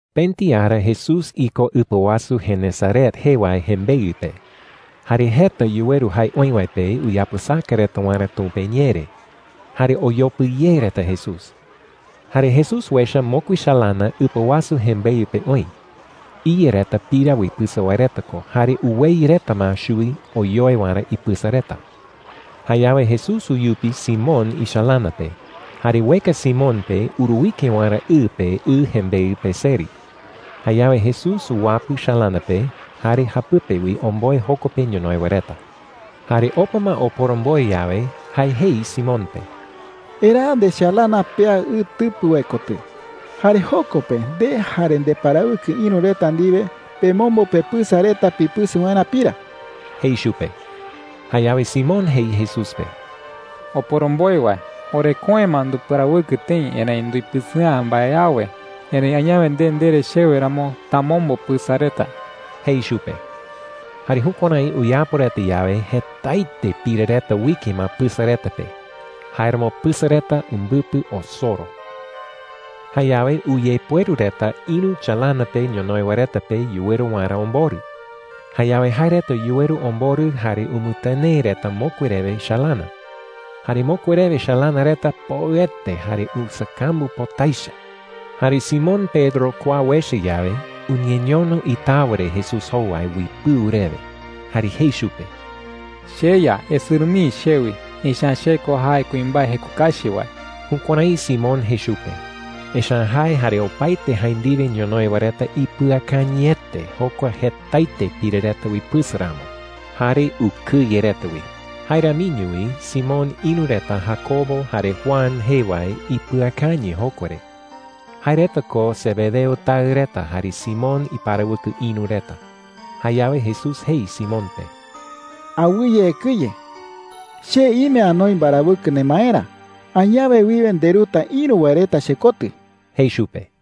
Pëti ara Jesús iko ɨpa wasu Genesaret jee wae jembeɨ pe. Jare jeta wae yuweru jae oï wae pe uyapɨsaka reta waerä Tumpa iñee re. Jare oyopɨ ye reta Jesús. Jare Jesús uecha mokui chalana ɨpa wasu jembeɨ pe oï. Iya reta pira uipɨsɨ wae reta ko, jare uweyɨ reta ma chuwi oyoe waerä ipɨsa reta. Jayawe Jesús uyupi Simón ichalana pe, jare ueka Simón pe uruike waerä ɨ pe ɨ jembeɨ pe seri. Jayawe Jesús uwapɨ chalana pe jare japɨpe wi omboe joko pe ñonoï wae reta. Jare opa ma oporomboe yawe, jae jei Simón pe: “Eraa ndechalana pea ɨ tɨpɨ wae kotɨ. Jare joko pe nde jare ndeparawɨkɨ ïru reta ndiwe pemombo pepɨsa reta pipɨsɨ waerä pira,” jei chupe. Jayawe Simón jei Jesús pe: “Oporomboe wae, oreköe ma nduparawɨkɨ tëi. Erëi nduipɨsɨ'ä mbae awe. Erëi añawe nde ndere chewe ramo, tamombo pɨsa reta,” jei chupe. Jare jukuärái uyapo reta yawe, jetaete pira reta uike ma pɨsa reta pe. Jáeramo pɨsa reta umbɨpɨ osoro. Jayawe uyepueru reta ïru chalana pe ñonoï wae reta pe yuweru waerä omborɨ. Jayawe jae reta yuweru omborɨ jare umɨtɨnee reta mokui rewe chalana. Jare mokui rewe chalana reta poɨete jare usakambu pota echa. Jare Simón Pedro kua uecha yawe, uñeñono itawa re Jesús jowai uipɨu rewe. Jare jei chupe: “CheYa, esɨrɨ mii chewi. Echa’ä che ko jae kuimbae jeko kachi wae.” Jukuärái Simón jei chupe, echa’ä jae jare opaete jae ndiwe ñonoï wae reta ipɨakañɨete jokua jetaete pira reta uipɨsɨ ramo, jare ukɨye reta wi. Jae ramiño wi Simón ïru reta Jacobo jare Juan jee wae ipɨakañɨ jokua re. Jae reta ko Zebedeo taɨ reta jare Simón iparawɨkɨ ïru reta. Jayawe Jesús jei Simón pe: “Awɨye ekɨye,” jei. “Che ime anoi mbarawɨkɨ nemaerä. Añawe wiwe nderuta ïru wae reta chekotɨ,” jei chupe.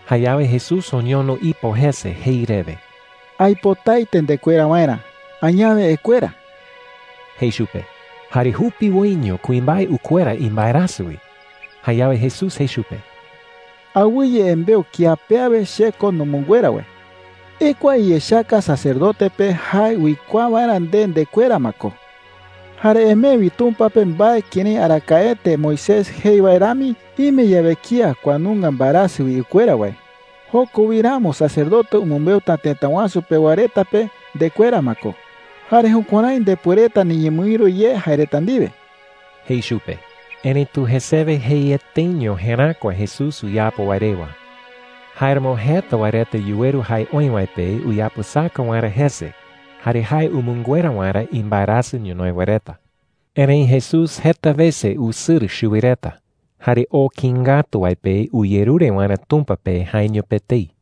Jayawe Jesús oñono ipo jese jei rewe: “Aipotaete ndekuera waerä. Añawe ekuera,” jei chupe. ¡Jare jupiwoiño kuimbae ukuera imbaerasɨ wi! Jayawe Jesús jei chupe: “Awɨye embeu kía pe awe che ko numɨnguera wae,” jei. “Ekua iyechaka sacerdote pe jae uikuaa waerä nde ndekuera ma ko. Jare emee wi Tumpa pe mbae kërái arakaete Moisés jei wae rami, ime yawe kía kua nunga mbaerasɨ wi ukuera wae. Joko wi ramo sacerdote umɨmbeuta tëta wasu pewa reta pe ndekuera ma ko, jare jukuärái ndepuereta niñemɨïru ye jae reta ndiwe,” jei chupe. Erëitu jesewe jeieteño jeräkua Jesús uyapo wae rewa. Jáeramo jeta wae reta yuweru jae oï wae pe uyapɨsaka waerä jese jare jae umɨnguera waerä imbaerasɨ ñonoï wae reta. Erëi Jesús jeta wese usɨrɨ chuwi reta, jare oo kïi ngatu wae pe uyerure waerä Tumpa pe jaeño pe etei.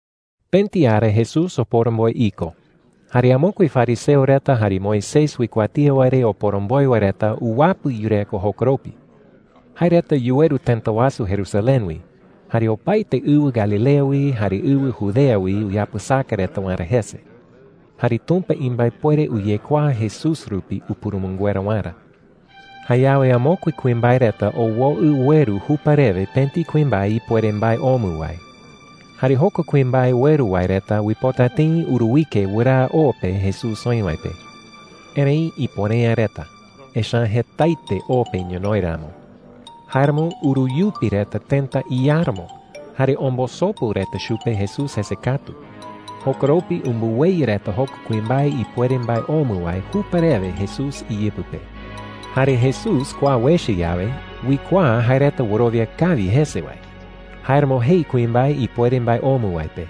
Pëti ara Jesús oporomboe iko, jare amokue fariseo reta jare Moisés uikuatía wae re oporomboe wae reta uwapɨ yureko jokoropi. Jae reta yuweru tëta wasu Jerusalén wi, jare opaete ɨwɨ Galilea wi, jare ɨwɨ Judea wi uyapɨsaka reta waerä jese. Jare Tumpa imbaepuere uyekuaa Jesús rupi upurumɨnguera waerä. Jayawe amokue kuimbae reta owoɨ ueru jupa rewe pëti kuimbae ipuere mbae omɨ wae. Jare jokua kuimbae ueru wae reta uipota tëi uruike wɨraa o pe Jesús oï wae pe. Erëi ipuere’ä reta, echa’ä jetaete o pe ñonoï ramo. Jáeramo uruyupi reta tëta iáramo, jare ombosopu reta chupe Jesús jese katu. Jokoropi umbɨweyɨ reta jokua kuimbae ipuere mbae omɨ wae jupa rewe Jesús iyɨpɨ pe. Jare Jesús kua uecha yawe, uikuaa jae reta wɨrowia kawi jese wae. Jáeramo jei kuimbae ipuere mbae omɨ wae pe: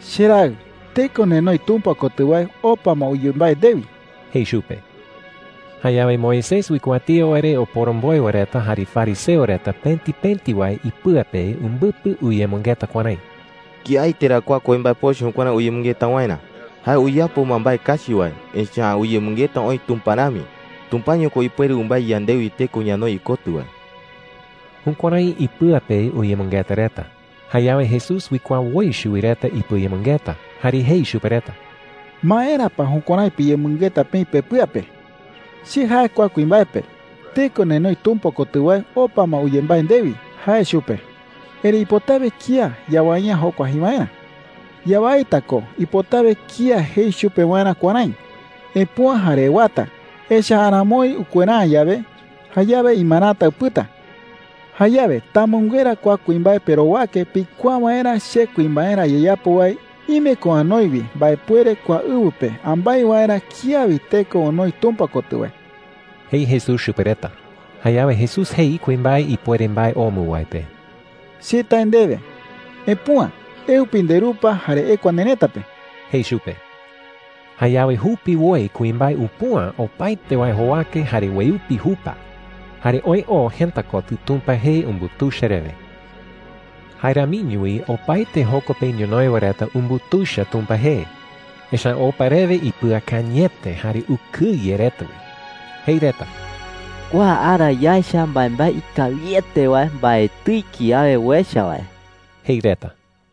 “Cheraɨ, teko nenoi Tumpa kotɨ wae opa ma uyembái ndewi,” jei chupe. Jayawe Moisés uikuatía wae re oporomboe wae reta jare fariseo reta pëti pëti wae ipɨa pe umbɨpɨ uyemɨngeta kuärái: “¿Kiaete ra kua kuimbae pochɨ jukuärái uyemɨngeta waerä? Jae uyapo ma mbae kachi wae, echa’ä uyemɨngeta oï Tumpa rami. Tumpaño ko ipuere umbái yandewi teko ñanoi ikotɨ wae.” Jukuärái ipɨa pe uyemɨngeta reta. Jayawe Jesús uikuaa woi chuwi reta ipɨayemɨngeta, jare jei chupe reta: “¿Maera pa jukuärái piyemɨngeta peï pepɨa pe?” jei. “Che jae kua kuimbae pe, ‘Teko nenoi Tumpa kotɨ wae opa ma uyembái ndewi,’ jae chupe. Erëi ipotawe kía yawai’ä jokua jei waerä,” jei. “Yawaita ko ipotawe kía jei chupe waerä kuärái: ‘Epüa jare ewata.’ Echa’ä aramoi ukuera’ä yawe, jayawe imarata upɨta,” jei. “Jayawe tamɨnguera kua kuimbae perowake pikuaa waerä che kuimbaerä ayeyapo wae ime ko anoi wi mbaepuere kua ɨwɨ pe ambái waerä kía wi teko onoi Tumpa kotɨ wae,” jei Jesús chupe reta. Jayawe Jesús jei kuimbae ipuere mbae omɨ wae pe: “Che tae ndewe, epüa. Eupi nderupa, jare ekua nerëta pe,” jei chupe. Jayawe jupiwoi kuimbae upüa opaete wae jowake jare ueupi jupa. Jare oë oo jëta kotɨ Tumpa jee umbutuicha rewe. Jae ramiño wi opaete joko pe ñonoï wae reta umbutuicha Tumpa jee. Echa’ä opa rewe ipɨakañɨete jare ukɨye reta wi. Jei reta: “¡Kua ara yaecha mbaembae ikawiete wae mbaetɨi kiawe uecha wae!” jei reta.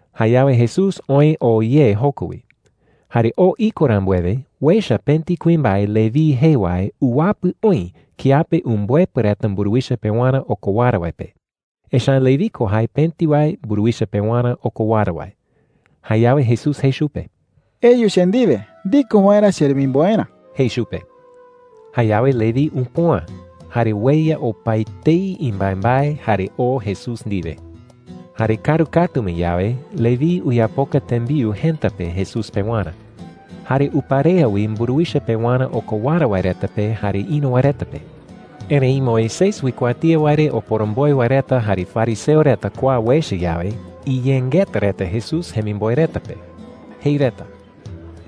Jayawe Jesús oë oo ye joko wi. Jare oo iko rambuewe, uecha pëti kuimbae Leví jee wae uwapɨ oï kiape umbɨepɨ reta mburuwicha pewarä okowara wae pe. Echa’ä Leví ko jae pëti wae mburuwicha pewarä okowara wae. Jayawe Jesús jei chupe: “Eyu che ndiwe ndiko waerä cheremimboerä,” jei chupe. Jayawe Leví upüa, jare ueya opaetei imbaembae, jare oo Jesús ndiwe. Jare kaaru katu ma yawe, Leví uyapoka tembiu jëta pe Jesús pewarä. Jare uparea wi mburuwicha pewarä okowara wae reta pe jare ïru wae reta pe. Erëi Moisés uikuatía wae re oporomboe wae reta jare fariseo reta kua uecha yawe, iyengeta reta Jesús jemimboe reta pe. Jei reta: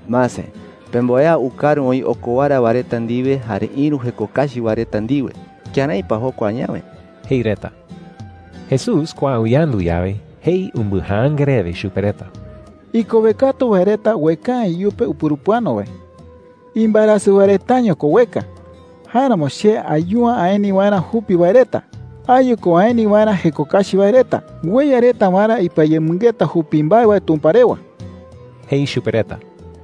“Mase, pemboea ukaru oï okowara wae reta ndiwe jare ïru jeko kachi wae reta ndiwe. ¿Kërái pa jokua añawe?” jei reta. Jesús kua uyandu yawe, jei umbɨjaanga rewe chupe reta: “Ikowe katu wae reta ueka’ä iyupe upurupɨano wae,” jei. “Imbaerasɨ wae retaño ko ueka. Jáeramo che ayu’ä aeni waerä jupi wae reta. Ayu ko aeni waerä jeko kachi wae reta ueya reta waerä ipɨayemɨngeta jupi mbae wae Tumpa rewa,” jei chupe reta.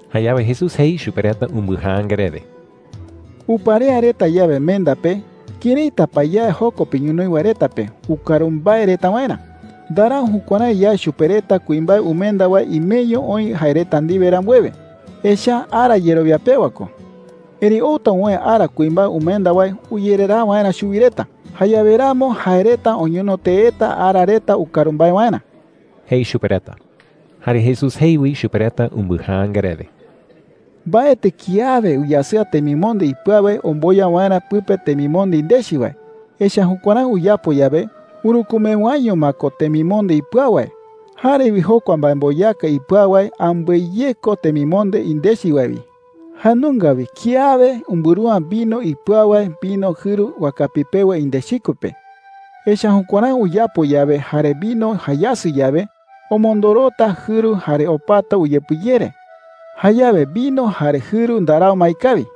Jayawe Jesús jei chupe reta umbɨjaanga rewe: “Uparea reta yawe menda pe, ¿këraita pa yae joko pe ñonoï wae reta pe ukaru mbae reta waerä? Ndarau jukuärái yae chupe reta kuimbae umenda wae imeño oï jae reta ndiwe rambuewe. Echa’ä ara yerowia pewa ko,” jei chupe reta. “Erëi outa uwäe ara kuimbae umenda wae uyereraa waerä chuwi reta. Jayawe ramo jae reta oñono teeta ara reta ukaru mbae waerä,” jei chupe reta. Jare Jesús jei wi chupe reta umbɨjaanga rewe: “Mbaetɨ kiawe uyasɨa temimonde ipɨau wae omboya waerä pɨpe temimonde indechi wae. Echa’ä jukuärái uyapo yawe, urükumewaiño ma ko temimonde ipɨau wae. Jare wi jokua mbaemboyaka ipɨau wae ambɨe ye ko temimonde indechi wae wi,” jei chupe reta. “Jae nunga wi kiawe umbɨru’ä vino ipɨau wae vino jɨru wakapi pewa indechikue pe. Echa’ä jukuärái uyapo yawe jare vino jayasɨ yawe, omondorota jɨru jare opata uyepɨyere. Jayawe vino jare jɨru ndarau ma ikawi.